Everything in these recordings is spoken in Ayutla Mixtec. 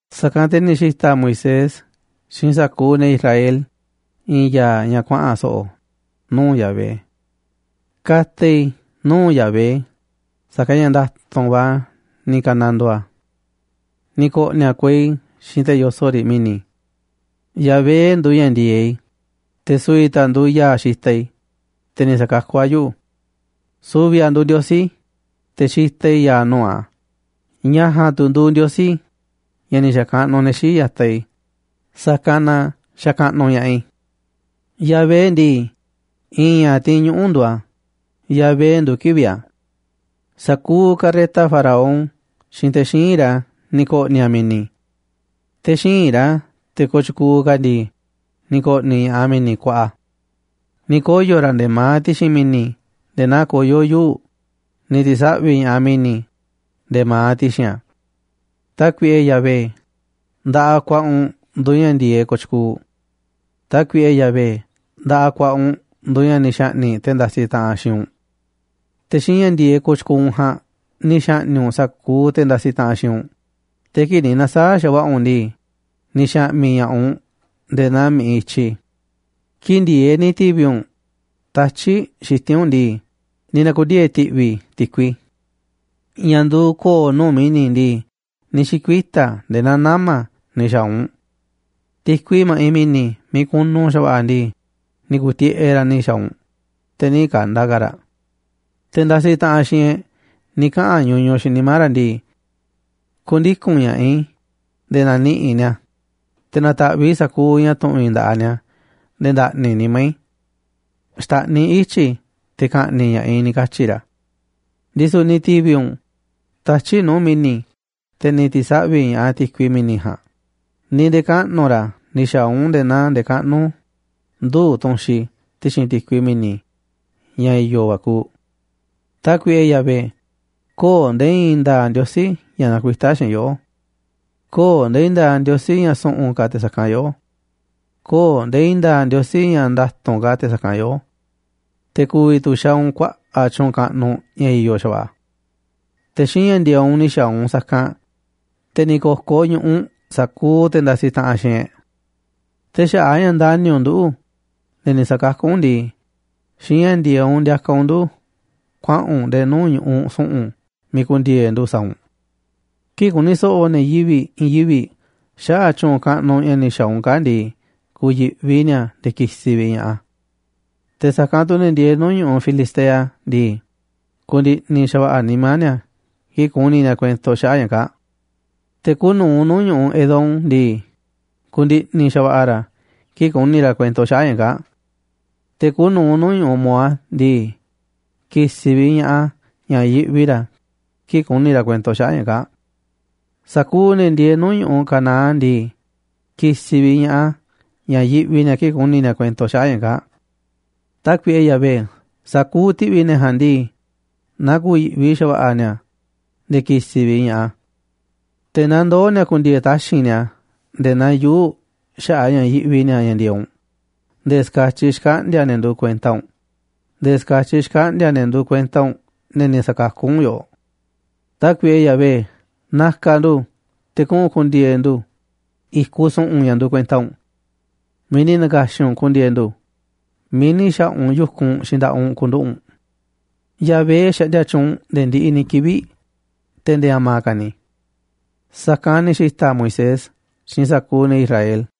Sa̱kanꞌ te̱ ni̱ xi̱ta̱ Moisés xiinꞌ sa̱kuuꞌ ne̱ Israel i̱i̱n ya̱a̱ ña̱ kuaꞌa̱n so̱ꞌo̱ nuu̱ꞌ Yahvé. “Ka̱ta̱ i̱ nuu̱ꞌ Yahvé, sa̱kanꞌ ña̱ nda̱tu̱nꞌ va̱ ni̱ ka̱nandoo a̱. Ni̱ ko̱ꞌni̱ a̱ kuei xiinꞌ te̱ yoso̱ꞌ riꞌ mi̱ni̱. Yahvé nduuꞌ ña̱ ndi̱e̱eꞌ i̱, te̱ su̱vi̱ tu̱ a̱ nduuꞌ ya̱a̱ xitaꞌ i̱, te̱ ni̱ sa̱kakú a̱ yuꞌu̱. Su̱vi̱ a̱ nduuꞌ Ndiosí i̱, te̱ xitaꞌ i̱ ya̱a̱ nuu̱ꞌ a̱, ña̱ ja̱a̱nꞌ tu̱ nduuꞌ Ndiosí ña̱ ni̱ xa̱kaꞌnuꞌ ne̱ xii̱ꞌ ya̱taꞌ i̱, sa̱kanꞌ na xa̱kaꞌnuꞌ ña̱ꞌaꞌ i̱. Yahvé ndii, i̱i̱n ña̱ tiinꞌ ñuꞌu̱ nduuꞌ a̱, Yahvé nduuꞌ kivi̱ꞌ a̱. Sa̱kuuꞌ carreta Faraón xiinꞌ te̱ xíinꞌ ra̱ ni̱ ko̱ꞌni̱ a̱ mi̱ni̱. Te̱ xíinꞌ ra̱, te̱ kooꞌ tyukuuꞌ ka̱ ndii, ni̱ ko̱ꞌni̱ ña̱ꞌaꞌ a̱ mi̱ni̱ kuaꞌa. Ni̱ koyo̱ ra̱ nde̱e̱ ma̱aꞌ ti̱xi̱n mi̱ni̱ nde̱e̱ naa koyó yuu̱ꞌ, ni̱ ti̱saꞌvi̱ ña̱ꞌaꞌ mi̱ni̱ nde̱e̱ ma̱aꞌ ti̱xi̱n a̱. Tákuiꞌe Yahvé, nda̱ꞌaꞌ ku̱a̱ꞌa̱ u̱nꞌ nduuꞌ ña̱ ndi̱e̱eꞌ kooꞌ tyukuuꞌ. Tákuiꞌe Yahvé, nda̱ꞌaꞌ ku̱a̱ꞌa̱ u̱nꞌ nduuꞌ ña̱ ni̱ xa̱ꞌni̱ꞌ te̱ ndasiꞌ taꞌanꞌ xiinꞌ u̱nꞌ. Te̱ xiinꞌ ña̱ ndi̱e̱eꞌ kooꞌ tyukuuꞌ u̱nꞌ ja̱a̱nꞌ ni̱ xa̱ꞌni̱ꞌ u̱nꞌ sa̱kuuꞌ te̱ ndasiꞌ taꞌanꞌ xiinꞌ u̱nꞌ, te̱ kii̱ꞌ ni̱ na̱saa̱ꞌ xa̱va̱ꞌa̱ u̱nꞌ ndii, ni̱ xa̱ꞌmi̱ ña̱ꞌaꞌ u̱nꞌ nde̱e̱ naa mi̱ꞌiꞌ i̱tyi. Kii̱ꞌ ndi̱e̱eꞌ ni̱ ti̱vi̱ u̱nꞌ tatyi̱ꞌ xiti̱nꞌ u̱nꞌ ndii, ni̱ na̱ku̱ndiee̱ ti̱ꞌvi̱ ti̱kui. Ña̱ nduuꞌ ko̱o̱ nuu̱ꞌ mi̱ni̱ ndii, ni̱ xi̱kuita̱ a̱ nde̱e̱ naa nama̱ ni̱ xa̱a̱ u̱nꞌ. Ti̱kui ma̱ꞌiꞌ mi̱ni̱ miiꞌ kunu xa̱va̱ꞌa̱ ndii, ni̱ ku̱u̱ tiꞌeꞌ raꞌ ni̱ xa̱a̱ u̱nꞌ, te̱ nï̱ ka̱nda̱ ka̱ raꞌ. Te̱ ndasiꞌ taꞌanꞌ xiinꞌ e̱ꞌ ni̱ kaꞌa̱n ñuñuꞌ xiinꞌ nimá ra̱ ndii: “Ku̱ndiku̱n ña̱ꞌaꞌ i̱ nde̱e̱ na̱niꞌi̱ꞌ i̱ ni̱a̱, te̱ na̱ta̱ꞌviꞌ i̱ sa̱kuuꞌ ña̱ tu̱ꞌu̱n i̱ nda̱ꞌaꞌ ni̱a̱ nde̱e̱ nda̱ꞌni̱ nimá i̱. Xta̱ꞌniꞌ i̱ ityi̱ i̱ te̱ ka̱ꞌni̱ꞌ ña̱ꞌaꞌ i̱,” ni̱ katyi̱ ra̱. Ndisu̱ ni̱ ti̱vi̱ u̱nꞌ tatyi̱ꞌ nuu̱ꞌ mi̱ni̱, te̱ ni̱ ti̱saꞌvi̱ ña̱ꞌaꞌ ti̱kui mi̱ni̱ ja̱a̱nꞌ, ni̱ nde̱kaꞌnu̱ ra̱ ni̱ xa̱a̱ u̱nꞌ nde̱e̱ naa ndekaꞌnú nduu̱ꞌ tu̱nxi ti̱xi̱n ti̱kui mi̱ni̱ ña̱ i̱yo̱ va̱ kuuꞌ. Tákuiꞌe Yahvé, köo̱ꞌ nde̱e̱ i̱i̱n nda̱a̱ꞌ ndiosí ña̱ nakuitá xiinꞌ yoꞌó. Köo̱ꞌ nde̱e̱ i̱i̱n nda̱a̱ꞌ ndiosí ña̱ su̱ꞌu̱n ka̱ te̱ sa̱kanꞌ yoꞌó. Köo̱ꞌ nde̱e̱ i̱i̱n nda̱a̱ꞌ ndiosí ña̱ nda̱tu̱nꞌ ka̱ te̱ sa̱kanꞌ yoꞌó. Te̱ ku̱vi̱ tu̱ xaaꞌ u̱nꞌ kuaꞌa̱ꞌ tyu̱u̱n kaꞌnuꞌ ña̱ i̱yo̱ xa̱va̱ꞌa̱. Te̱ xiinꞌ ña̱ ndi̱e̱eꞌ u̱nꞌ ni̱ xa̱a̱ u̱nꞌ sa̱kanꞌ, te̱ ni̱ ko̱koꞌ ñu̱ꞌuꞌ sa̱kuuꞌ te̱ ndasiꞌ taꞌanꞌ xiinꞌ e̱ꞌ. Te̱ xaꞌa̱ꞌ a̱ ña̱ ndani̱ u̱nꞌ nduꞌu̱, ne̱ ni̱ sa̱kakú u̱nꞌ ndii, xiinꞌ ña̱ ndi̱e̱eꞌ u̱nꞌ ndiakaꞌ u̱nꞌ ndu̱ kuaꞌa̱n u̱nꞌ nde̱e̱ nuu̱ꞌ ñu̱ꞌuꞌ su̱ꞌu̱n miiꞌ ku̱ndi̱e̱e̱ ndu̱ sa̱a̱ u̱nꞌ. Kii̱ꞌ ku̱ni̱ so̱ꞌo̱ ne̱ yivi̱ꞌ i̱i̱n yivi̱ꞌ xaꞌa̱ꞌ tyu̱u̱n kaꞌnuꞌ ña̱ ni̱ xa̱a̱ u̱nꞌ kaa̱ꞌ ndii, ku̱yi̱ꞌvi ni̱a̱ nde̱e̱ ki̱si̱ vi̱ꞌ ña̱ꞌaꞌ a̱. Te̱ sa̱kanꞌ tu̱ ne̱ ndieeꞌ nuu̱ꞌ ñu̱ꞌuꞌ Filistea ndii, ku̱ndi̱ꞌni̱ xa̱va̱ꞌa̱ nimá ni̱a̱ kii̱ꞌ ku̱ni̱ ni̱a̱ kuento xaꞌa̱ꞌ ña̱ kaa̱ꞌ. Te̱ kuuꞌ nu̱uꞌ nuu̱ꞌ ñu̱ꞌuꞌ Edom ndii, ku̱ndi̱ꞌni̱ xa̱va̱ꞌa̱ ra̱ kii̱ꞌ ku̱ni̱ ra̱ kuento xaꞌa̱ꞌ ña̱ kaa̱ꞌ. Te̱ kuuꞌ nu̱uꞌ nuu̱ꞌ ñu̱ꞌuꞌ Moab ndii, ki̱si̱ vi̱ꞌ ña̱ꞌaꞌ a̱ ña̱ yiꞌvi ra̱ kii̱ꞌ ku̱ni̱ ra̱ kuento xaꞌa̱ꞌ ña̱ kaa̱ꞌ. Sa̱kuuꞌ ne̱ ndieeꞌ nuu̱ꞌ ñu̱ꞌuꞌ Canaán ndii, ki̱si̱ vi̱ꞌ ña̱ꞌaꞌ a̱ ña̱ yiꞌvi ni̱a̱ kii̱ꞌ ku̱ni̱ ni̱a̱ kuento xaꞌa̱ꞌ ña̱ kaa̱ꞌ. Tákuiꞌe Yahvé, sa̱kuuꞌ ti̱ꞌvi̱ ne̱ ja̱a̱nꞌ ndii, na ku̱yi̱ꞌvi xa̱va̱ꞌa̱ ni̱a̱, nde̱e̱ ki̱si̱ vi̱ꞌ ña̱ꞌaꞌ a̱. Te̱ na ndoo̱ ni̱a̱ ku̱ndi̱e̱e̱ taxi̱nꞌ ni̱a̱ nde̱e̱ naa yuu̱ꞌ xaꞌa̱ꞌ a̱ ña̱ yiꞌvi ni̱a̱ ña̱ ndi̱e̱eꞌ u̱nꞌ, nde̱e̱ ska̱tyiꞌ xkaꞌndi̱a̱ ne̱ nduuꞌ kuenta u̱nꞌ, nde̱e̱ ska̱tyiꞌ xkaꞌndi̱a̱ ne̱ nduuꞌ kuenta u̱nꞌ, ne̱ ni̱ sa̱kakú u̱nꞌ yoꞌoꞌ. Tákuiꞌe Yahvé, na̱ka̱ ndu̱ te̱ kuꞌu̱n ku̱ndi̱e̱e̱ ndu̱ i̱kuꞌ su̱ꞌu̱n ña̱ nduuꞌ kuenta u̱nꞌ, miiꞌ ni̱ na̱ka̱xi̱n u̱nꞌ ku̱ndi̱e̱e̱ ndu̱, miiꞌ ni̱ xa̱ꞌa̱ u̱nꞌ yu̱kunꞌ xiinꞌ nda̱ꞌaꞌ u̱nꞌ ku̱nduꞌu̱ꞌ u̱nꞌ. Yahvé xaꞌndia tyuunꞌ nde̱e̱ ndiꞌiꞌ ni̱ kivi̱ꞌ, te̱ nde̱e̱ a̱ma̱ ka̱ ni̱.” Sa̱kanꞌ ni̱ xi̱ta̱ Moisés xiinꞌ sa̱kuuꞌ ne̱ Israel.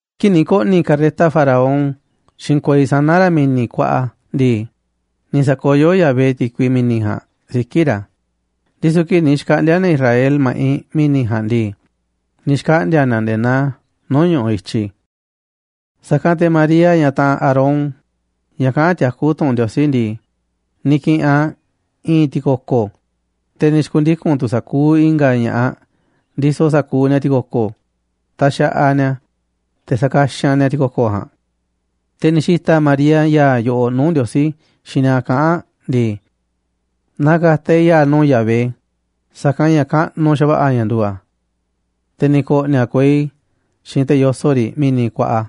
Kii̱ꞌ ni̱ ko̱ꞌni̱ carreta Faraón xiinꞌ kuei sana̱ ra̱ mi̱ni̱ kuaꞌa ndii, ni̱ sa̱koyó Yahvé ti̱kui mi̱ni̱ ja̱a̱nꞌ siki̱ꞌ ra̱, ndisu̱ kii̱ꞌ ni̱ xkaꞌndi̱a̱ ne̱ Israel ma̱ꞌiꞌ mi̱ni̱ ja̱a̱nꞌ ndii, ni̱ xkaꞌndi̱a̱ ni̱a̱ nde̱e̱ naa nuu̱ꞌ ñu̱ꞌuꞌ i̱tyi. Sa̱kanꞌ te̱ María, ñaꞌ taꞌanꞌ Aarón, ñaꞌ kaꞌán tiakú tu̱ꞌu̱n Ndiosí ndii, ni̱ ki̱ꞌi̱n aꞌ i̱i̱n ti̱ko̱ko̱, te̱ ni̱ xi̱ku̱ndiku̱n tu̱ sa̱kuuꞌ i̱nga̱ ña̱ꞌaꞌ ndisoꞌ sa̱kuuꞌ ni̱a̱ ti̱ko̱ko̱, taxaꞌaꞌ ni̱a̱ te̱ sa̱kaxanꞌ ni̱a̱ ti̱ko̱ko̱ ja̱a̱nꞌ. Te̱ ni̱ xi̱ta̱ María ya̱a̱ yoꞌoꞌ nuu̱ꞌ Ndiosí xiinꞌ ni̱a̱ kaꞌán aꞌ ndii: Na ka̱ta̱ e̱ꞌ ya̱a̱ nuu̱ꞌ Yahvé, sa̱kanꞌ ña̱ kaꞌnuꞌ xa̱va̱ꞌa̱ ña̱ nduuꞌ a̱. Te̱ ni̱ ko̱ꞌni̱ a̱ kuei xiinꞌ te̱ yoso̱ꞌ riꞌ mi̱ni̱ kuaꞌa.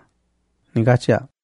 Ni̱ katyi̱ aꞌ.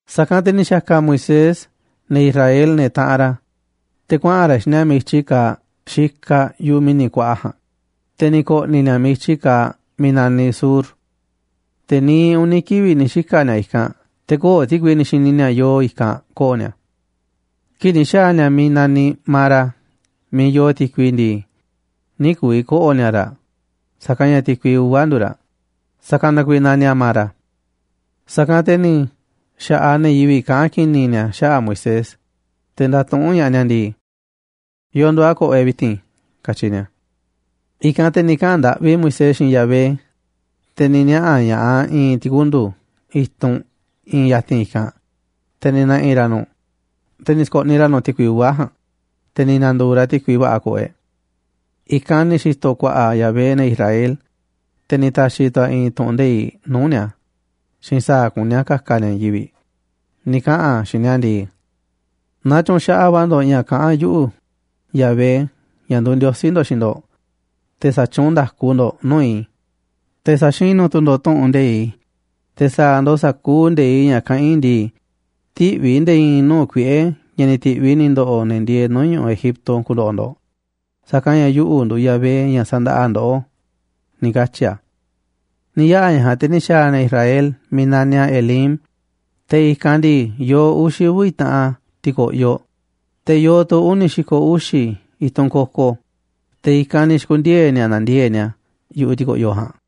Sa̱kanꞌ te̱ ni̱ xa̱ka̱ Moisés ne̱ Israel, ne̱ taꞌanꞌ ra̱, te̱ kuaꞌa̱n ra̱ xiinꞌ ni̱a̱ miiꞌ i̱tyi kaaꞌ xikaꞌ yu̱ꞌuꞌ mi̱ni̱ kuaꞌa ja̱a̱nꞌ, te̱ ni̱ ko̱ꞌni̱ ni̱a̱ miiꞌ i̱tyi kaaꞌ miiꞌ naniꞌ Shur. Te̱ niiꞌ uni̱ kivi̱ꞌ ni̱ xika̱ ni̱a̱ i̱kanꞌ, te̱ köo̱ꞌ ti̱kui ni̱ xi̱ni̱ ni̱a̱ yoo i̱kanꞌ ko̱ꞌo̱ ni̱a̱. Kii̱ꞌ ni̱ xa̱a̱ ni̱a̱ miiꞌ naniꞌ Mara miiꞌ yoo ti̱kui ndii, nï̱ ku̱vi̱ ko̱ꞌo̱ ni̱a̱ raꞌ, sa̱kanꞌ ña̱ ti̱kui uva̱ nduuꞌ raꞌ, sa̱kanꞌ na kuiiꞌ naniꞌ a̱ Mara. Sa̱kanꞌ te̱ ni̱ xa̱ꞌaꞌ ne̱ yivi̱ꞌ kaꞌán ki̱ni̱ ni̱a̱ xaꞌa̱ꞌ Moisés, te̱ ndatuꞌúnꞌ ña̱ꞌaꞌ ni̱a̱ ndii: ―¿Yo̱o̱ nduuꞌ a̱ ko̱ꞌo̱ e̱ꞌ vi̱ti̱n? ―katyi ni̱a̱. I̱kanꞌ te̱ ni̱ kaꞌa̱n ndaꞌvi Moisés xiinꞌ Yahvé, te̱ ni̱ niaꞌa̱ ña̱ꞌaꞌ a̱ i̱i̱n ti̱kundu̱ i̱tunꞌ iinꞌ ya̱ti̱n i̱kanꞌ, te̱ ni̱ na̱ꞌi̱ ra̱ nu̱ꞌ, te̱ ni̱ sko̱ꞌniꞌ ra̱ nu̱ꞌ ti̱kui uva̱ ja̱a̱nꞌ, te̱ ni̱ na̱ndu̱u̱ raꞌ ti̱kui va̱ꞌa̱ ko̱ꞌo̱ e̱ꞌ. I̱kanꞌ ni̱ xi̱to̱ ku̱a̱ꞌa̱ Yahvé ne̱ Israel, te̱ ni̱ ta̱xi̱ tu̱ a̱ i̱i̱n tu̱ꞌu̱n nde̱iꞌ nuu̱ꞌ ni̱a̱ xiinꞌ sa̱a̱ kuní a̱ ka̱ka̱ ni̱a̱ i̱i̱n yivi̱ꞌ. Ni̱ kaꞌa̱n a̱ xiinꞌ ni̱a̱ ndii: ―Naaꞌ tyu̱nxaꞌaꞌ va̱ ndo̱ꞌ ña̱ kaꞌán yuꞌu̱, Yahvé, ña̱ nduuꞌ Ndiosí ndo̱ꞌ, xiinꞌ ndo̱ꞌ, te̱ sa̱tyuunꞌ nda̱ku ndo̱ꞌ nuu̱ꞌ i̱, te̱ sa̱xinu̱ tu̱ ndo̱ꞌ tu̱ꞌu̱n nde̱iꞌ i̱, te̱ sa̱a̱ ndo̱ꞌ sa̱kuuꞌ nde̱iꞌ ña̱ kaꞌán i̱ ndii, tï̱ꞌviꞌ i̱ nde̱e̱ i̱i̱n nuu̱ꞌ kuiꞌe̱ ña̱ ni̱ ti̱ꞌviꞌ i̱ ni̱ ndo̱ꞌo̱ ne̱ ndieeꞌ nuu̱ꞌ ñu̱ꞌuꞌ Egipto ku̱ndo̱ꞌo̱ ndo̱ꞌ, sa̱kanꞌ ña̱ yuꞌu̱ nduuꞌ Yahvé, ña̱ sandaꞌaꞌ ndoꞌó ―ni̱ katyi̱ a̱. Ni̱ yaꞌa̱ ña̱ ja̱a̱nꞌ, te̱ ni̱ xa̱a̱ ne̱ Israel miiꞌ naniꞌ a̱ Elim, te̱ i̱kanꞌ ndii, yoo uxi̱ uvi̱ taꞌan ti̱ko̱ꞌyoꞌ, te̱ yoo tu̱ uni̱ xi̱ko̱ uxi̱ i̱tunꞌ koko, te̱ i̱kanꞌ ni̱ xi̱ku̱ndiee̱ ni̱a̱ nandiee̱ꞌ ni̱a̱ yu̱ꞌuꞌ ti̱ko̱ꞌyoꞌ ja̱a̱nꞌ.